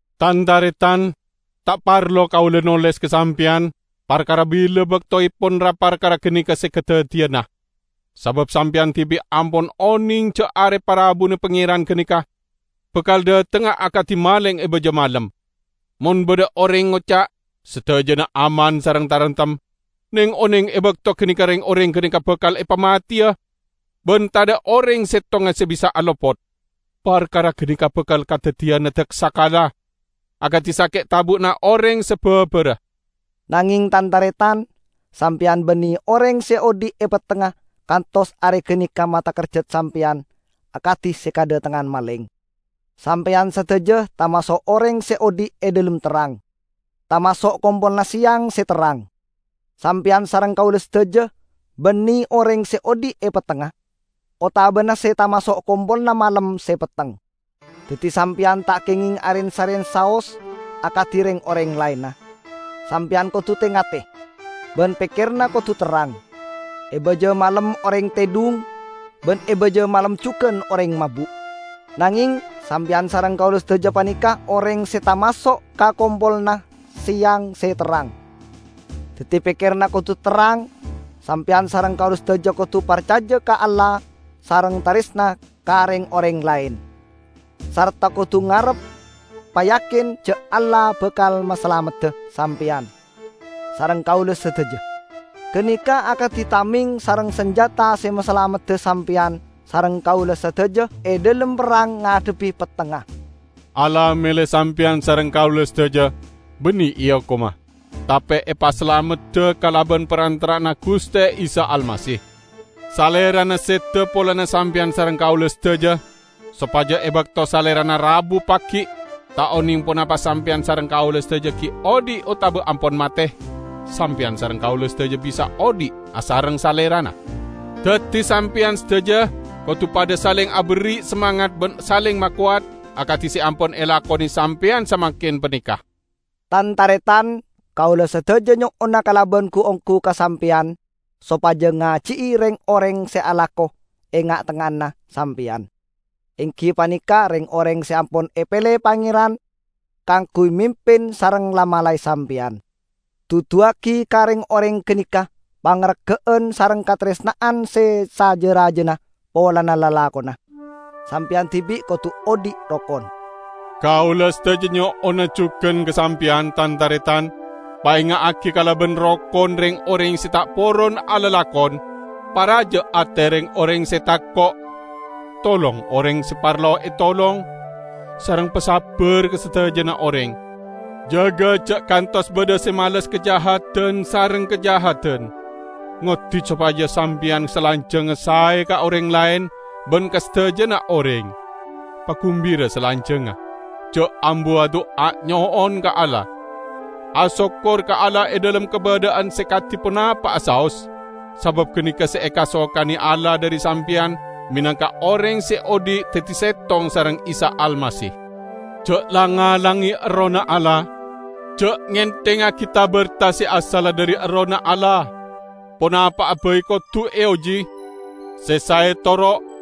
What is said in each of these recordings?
Tan-taretan, ta' parlo kaula noles ka sampeyan parkara bila baktoepon ra-parkara ganeka se kadaddiyana. Sabab sampeyan dibi' ampon oneng ja' Are Parabuna Pangeran ganeka bakal dhatengnga akadi maleng e baja malem. Mon badha oreng ngoca', "Sadajana aman sareng taremtem," neng-oneng e bakto ganeka reng-oreng ganeka bakal epamateya, ban tadha' oreng settonga se bisa'a lopot. Parkara ganeka bakal kadaddiyanna daksakala, akadi sake' tabu'na oreng se babara. Nangeng tan-taretan, sampeyan banne oreng se odhi' e pettengnga kantos are ganeka matakerjat sampeyan akadi se kadhatengngan maleng. Sampeyan sadaja tamaso' oreng se odhi' e dhalem terrang; tamaso' kompolanna seyang se terrang. Sampeyan sareng kaula sadaja banne oreng se odhi' e pettengnga, otabana se tamaso' kompolanna malem se petteng. Daddi sampeyan ta' kengeng aren-saren saos akadi reng-oreng laenna; sampeyan kodu te-ngate, ban pekkeranna kodu terrang. E baja malem oreng tedhung, ban e baja malem jugan oreng mabu'. Nangeng sampeyan sareng kaula sadaja paneka oreng se tamaso' ka kompolanna seyang se terrang; daddi pekkeranna kodu terrang. Sampeyan sareng kaula sadaja kodu parcaja ka Allah sareng taresna ka reng-oreng laen, sarta kodu ngarep payakin ja' Allah bakal masalamedda sampeyan sareng kaula sadaja. Ganeka akadi tameng sareng sanjata se masalamedda sampeyan sareng kaula sadaja e dhalem perrang ngadhebbi pettengnga. Allah mele sampeyan sareng kaula sadaja banne eokoma, tape epasalamedda kalaban parantara'anna Guste Isa Almasih. Salerana seda polana sampeyan sareng kaula sadaja, sopaja e bakto Salerana rabu pagi' -- ta' oneng ponapa sampeyan sareng kaula sadaja gi' odhi' otaba ampon mate -- sampeyan sareng kaula sadaja bisa odhi' asareng Salerana. Daddi sampeyan sadaja kodu padha saleng aberri' samangat ban saleng makowat, akadi se ampon elakone sampeyan samangken paneka. Tan-taretan, kaula sadaja nyo'ona kalaban gu-onggu ka sampeyan sopaja ngaji'i reng-oreng se alako e nga'-tengnga'anna sampeyan; enggi paneka reng-oreng se ampon epele Pangeran kaangguy mimpin sareng la-malae sampeyan. Duduwagi ka reng-oreng ganeka pangarga'an sareng kataresna'an se saja-rajana polana lalakonna. Sampeyan dibi' kodu odhi' rokon. Kaula sadaja nyo'ona jugan ka sampeyan, tan-taretan, paenga'agi kalaban rokon reng-oreng se ta' poron alalakon, paraja ate reng-oreng se tako', tolong oreng se parlo etolong, sareng pasabbar ka sadajana oreng. Jaga ja' kantos badha se males kajahadan sareng kajahadan. Ngoddi sopaja sampeyan salanjangnga sae ka oreng laen ban ka sadajana oreng. Pagumbira salanjangnga, ja' ambu adu'a nyo'on ka Allah. Asokkor ka Allah e dhalem kabadha'an se kadi ponapa'a saos, sabab ganeka se ekasokane Allah dhari sampeyan menangka oreng se odhi' daddi settong sareng Isa Almasih. Ja' lang-ngalange Errohna Allah. Ja' ngenthengngagi ta-berta se asalla dhari Errohna Allah. Ponapa'a bai kodu eoji: se sae toro',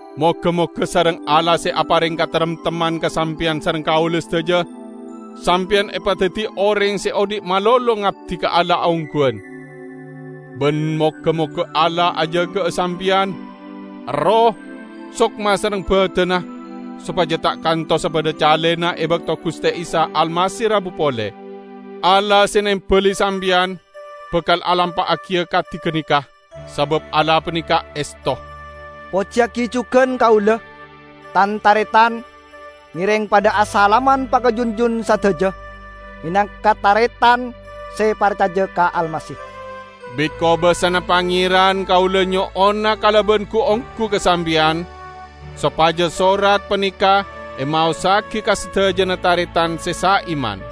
Moga-moga sareng Allah se apareng kataremtemman ka sampeyan sareng kaula sadaja, sampeyan epadaddi oreng se odhi' malolo ngabdi ka Allah ongguwan. Ban moga-moga Allah ajaga'a sampeyan, erroh, sokma sareng badanna, sopaja ta' kantosa badha calena e bakto Guste Isa Almasih rabu pole. Allah se nembali sampeyan, bakal alampa'agiya kadi ganeka, sabab Allah paneka esto. Pojiyagi jugan kaula, tan-taretan! Ngereng padha asalaman pakajunjun sadaja menangka taretan se parcaja ka Almasih. Bit kobasana Pangeran kaula nyo'ona kalaban gu-onggu ka sampeyan sopaja sorat paneka emaossagi ka sadajana taretan se saiman.